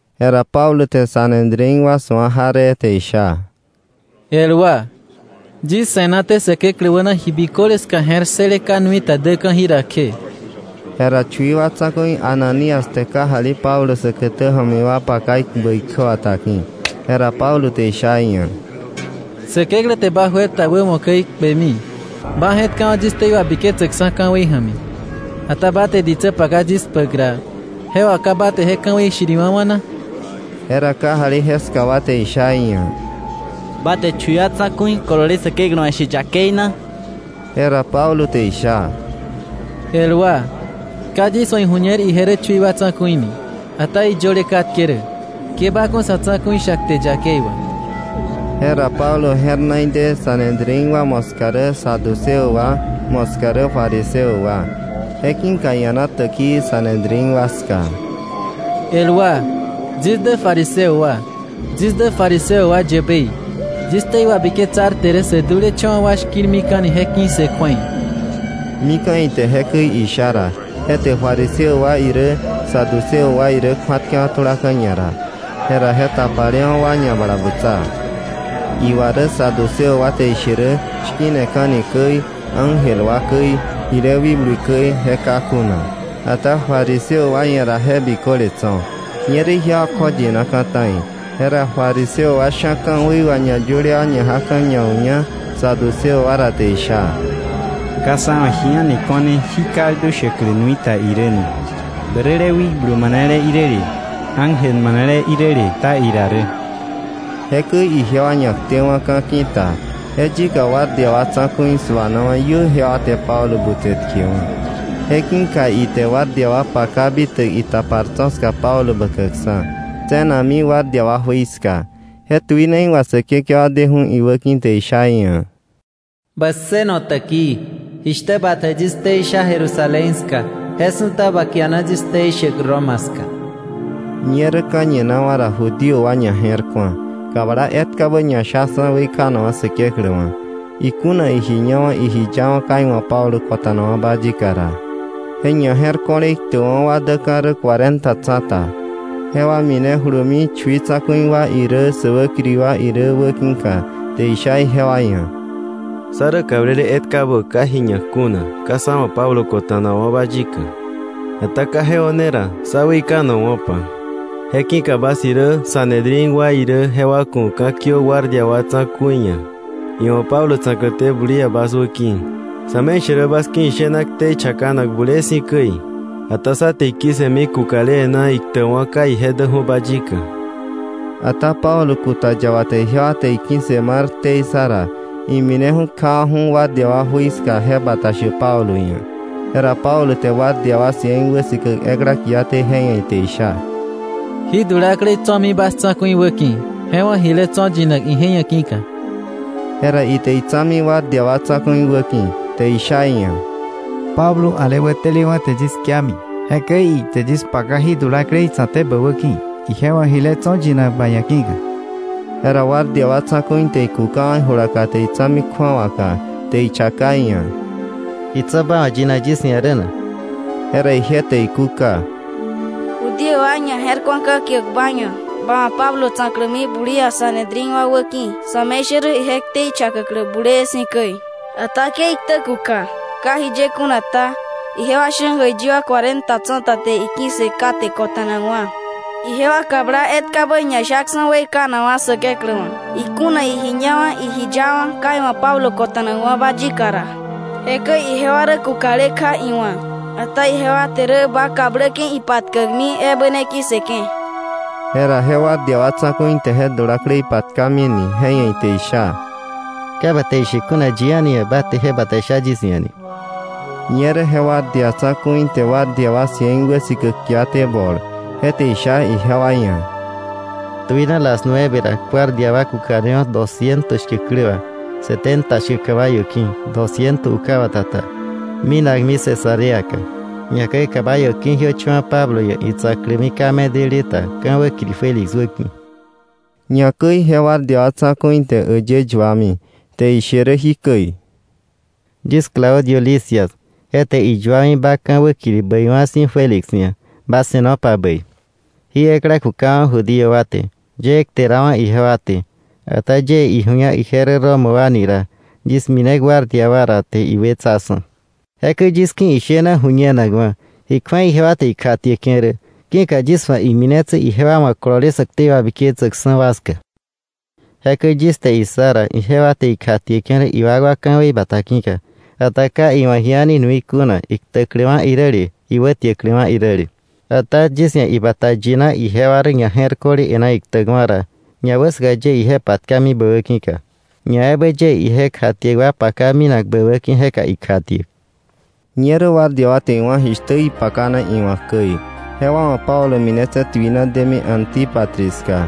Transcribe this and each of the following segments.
Jera Pablo te Sanedrín wa su̱a jaree te isha: —El wa, yis se̱naté Säkeklä wäna ji biköle ska je̱r ssële ka nuita däka̱ jira kje. Jera chui wa tsa̱ku̱i Ananías te kajali Pablo säkätä ja̱mi wa paka ikpäk ikjäbata ki̱. Jera Pablo te isha iia̱: —Säkeklä te ba juer ta wämo käi kpemi. Ba je̱tkawa̱ yis ktei wabiketsäkksa̱ ka̱wei ja̱mi, ata ba te ditsä paka yis kpäk ra, ¿je wà ka ba te je ka̱wei shiriwa̱wa̱ na? Jera kajali jeska wa te isha iia̱: —¿Ba te chui wa tsa̱ku̱i kolole Säkeklä wa̱ she yakei na? Jera Pablo te isha: —El wa, ka yis wa̱ iju̱ñer ije rä chui wa tsa̱ku̱i ni. Ata iyöle katke rä: ‘Ke ba ku̱ sa̱ tsa̱ku̱i sha kte yakei wà.’ Jera Pablo je̱r na ide Sanedrín wa moska rä saduceo wa, moska rä fariseo wa. Je ki̱ka ia̱na täkii Sanedrín wa ska: —El wa, yis dä fariseo wa, yis dä fariseo wa yäbei, yis ktei wabiketsarte rä sä dulecha̱wa̱ wa shki̱rmika̱ni je ki̱ssë kju̱ei. Mika̱ ite jekäi isha ra, je te fariseo wa irä, saduceo wa irä kju̱atkewa̱ tulaka̱ ñara. Jera je tapalewa̱ wa ñabalabutsa. Iwa rä Saduceo wa te ishe rä shki̱neka̱ni käi, ángel wa käi, jile wikblu käi, je ka kuna. Ata fariseo wa ia̱ ra je biköle tso̱. Ñerä ijewa kjoyinaka̱ ta̱i. Jera fariseo wa sha̱ ka̱wei wà ñayöle wa ñajaka̱ ñau̱ña saduceo wa ra, te isha: —Ka sá wa̱ ji a̱ni ko̱ne jí kaldu shäklä nui ta irä ni; bäräle wikblu manele iräle, ángel manele iräle kta ira rä. Jekäi ijewa ñaktewa̱ka̱ ki̱ta, je yika guardia wa tsa̱ku̱i su̱anawa̱ iö ijewa te Pablo butse tkewa̱. Je ki̱ka ite guardia wa paka bitäk itapar tso̱ ska Pablo bäkäkksa̱, tse̱nakmi guardia wa jui ska. Je tuinei wà Säkekewa deju̱ iwäki̱ te sha iia̱: “Bä ssëno täkii. Jishtä ba te yis ktei sha Jerusalén ska, je su̱ta ba kiana yis ktei shäk Roma ska.” Ñerä ka̱ñinawa̱ ra Judío wa ñaje̱rku̱a, kabla etkabä ñashaksa̱ weikanakwa̱ Säkeklä wa̱, iji ñawa̱ iji yawa̱ ka iwa̱ Pablo kota̱nawa̱ba yika ra. Je ñaje̱rko̱le iktäkwa̱ wa däka̱ rä cuarenta tsa̱ta. Jewa minejulumi chui tsa̱ku̱i wa irä, sä wäkiri wa irä wäki̱ka te isha ijewa ia̱: —Sá rä kablele etkabä ka ji ñak kuna, ka sá wa̱ Pablo kota̱nawa̱ba yika. Ata ka je o̱ne ra sá weikanowa̱pa. Je ki̱ka bas irä Sanedrín wa irä jewa ku̱ ka̱ kiö guardia wa tsa̱ku̱i ia̱, iwa̱ Pablo tsa̱kläté bulia bas wäki̱, sa̱me̱ishärä bas ki̱ ishena ktei chakanak bulee si̱ käi. Ata sá te iki̱ssëmi kukale e̱ná iktäkwa̱ ka ije däju̱ba yika. Ata Pablo kuta yaba te ijewa te iki̱ssë mar ktei ssa ra, imineju̱ kjawa̱ju̱ guardia wa jui ska je bata shäk Pablo ia̱. Jera Pablo te guardia wa cien wäsikäk ekla kiaté, je ia̱ ite isha: —Jí dulaklei tso̱mi bas tsa̱ku̱i wäki̱, je wa̱ jile tso̱ yinak ije ia̱ ki̱ka. Jera ite itsa̱mi guardia wa tsa̱ku̱i wäki̱, te isha iia̱: —Pablo, ale wätelewa̱ te yis kiami, jekäi ite yis paka jí dulaklei tsa̱kté bä wäki̱, ije wa̱ jile tso̱ yinak ba ia̱ ki̱ka. Jera guardia wa tsa̱ku̱i te ikukawa̱ ijulaka te itsa̱mi kju̱awaka, te ichaka iia̱: —¿Ji tso̱ ba wa̱ yinak yis ia̱ rä na? Jera ije te ikúka: —Judío wa ñaje̱rku̱a ka̱kiäk ba ia̱, ba wa̱ Pablo tsa̱klämi bulia Sanedrín wa wäki̱, sa̱me̱ishärä ije ktei chakäklä bulee si̱ käi. Ata ke iktä kuka. Ka jiye kuna ta, ijewa sha̱ jäiyi wa cuarenta tsa̱ta te iki̱ssë kate kota̱nakwa̱. Ijewa kabla etkabä ñashaksa̱ weikanakwa̱ Säkeklä wa̱, iji ñawa̱ iji yawa̱ ka iwa̱ Pablo kota̱nawa̱ba yika ra. Jekäi ijewa rä kukale kja iwa̱k, ata ijewa te rä ba kabläke̱ ipatkäkmi ebä ne ki̱ssëke̱. Jera je guardia wa tsa̱ku̱i te je dulaklei patkamine, je ia̱ ite isha: —Ka ba te ishe kuna yi a̱ni ia̱ ba te je bata sha yis ia̱ ni. Ñerä je guardia tsa̱ku̱i te guardia wa cien wäsikäk kiaté bol te isha ijewa ia̱: —Tuina las nueve ra guardia wa kukanewo̱, dosciento shkäk klä wà, setenta shkäk caballo ki̱, dosciento ukabata ta, minakmi Cesareaka, ñakäi caballo ki̱jiöcha̱wa̱ Pablo ia̱ itsa̱klämi ka medele ta ka̱ wäkiri Félix wäki̱. Ñakäi je guardia wa tsa̱ku̱i te äyë yuami, te ishe rä jikäi: “Yis Claudio Lisias, je te iyuami ba ka̱ wäkiri bäiwa̱ si̱ Félix ia̱: Ba se̱nopa bäi. Jí ekla kukawa̱ Judío wa te, yëë kterawa̱ ijewa te. Ata yie iju̱ña ije rä Roma wa ni ra, yis mine guardia wa ra, te iwetsaksa̱. Jekäi yis ki̱ ishena ju̱ñenakwa̱ ji kju̱ei ijewa te ikjatieke̱ rä ki̱ka yis wa̱ iminetse̱ ijewa wa̱ kolole sä ktei wabiketsäkksa̱ wa ska. Jekäi yis te issa ra ijewa te ikjatieke̱ rä iwakwa ka̱wei bata ki̱ka. Ata ka iwa̱ ji a̱ni nui kuna, iktäkläwa̱ iräle iwätiäkläwa̱ iräle. Ata yis ia̱ ibata yina ijewa rä ñaje̱rko̱le e̱ná iktäkwa̱ ra, ñawäsaka yie ije patkami bä wäki̱ka. Ñaebä yie ije kjatiäk wa paka minak bä wäki̱ jeka ikjatiäk.” Ñerä guardia wa te iwá̱ jishtä ipakana iwa̱k käi. Jewa wa̱ Pablo minetse̱ tuina demi Antípatris ska.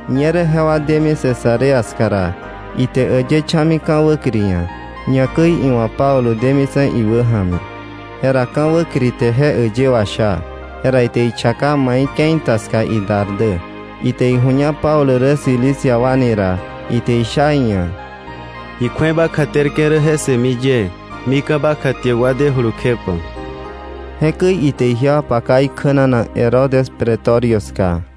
Ñerä jewa demi Cesarea ska ra, ite äyë cha̱mi ka̱ wäkiri ia̱, ñakäi iwa̱ Pablo demitse̱ iwäja̱mi. Jera ka̱ wäkiri te je äyë washa, jera ite ichaka mai ke̱i ta ska idar dä. Ite iju̱ña Pablo rä Cilicia wa ni ra, ite isha iia̱: —Ji kju̱ei ba kjaterke̱ rä je ssëmi yie, mika̱ ba kjatiäkwa dejulu kjepa. Jekäi ite ijewa paka ikjänanak Herodes pretorio ska.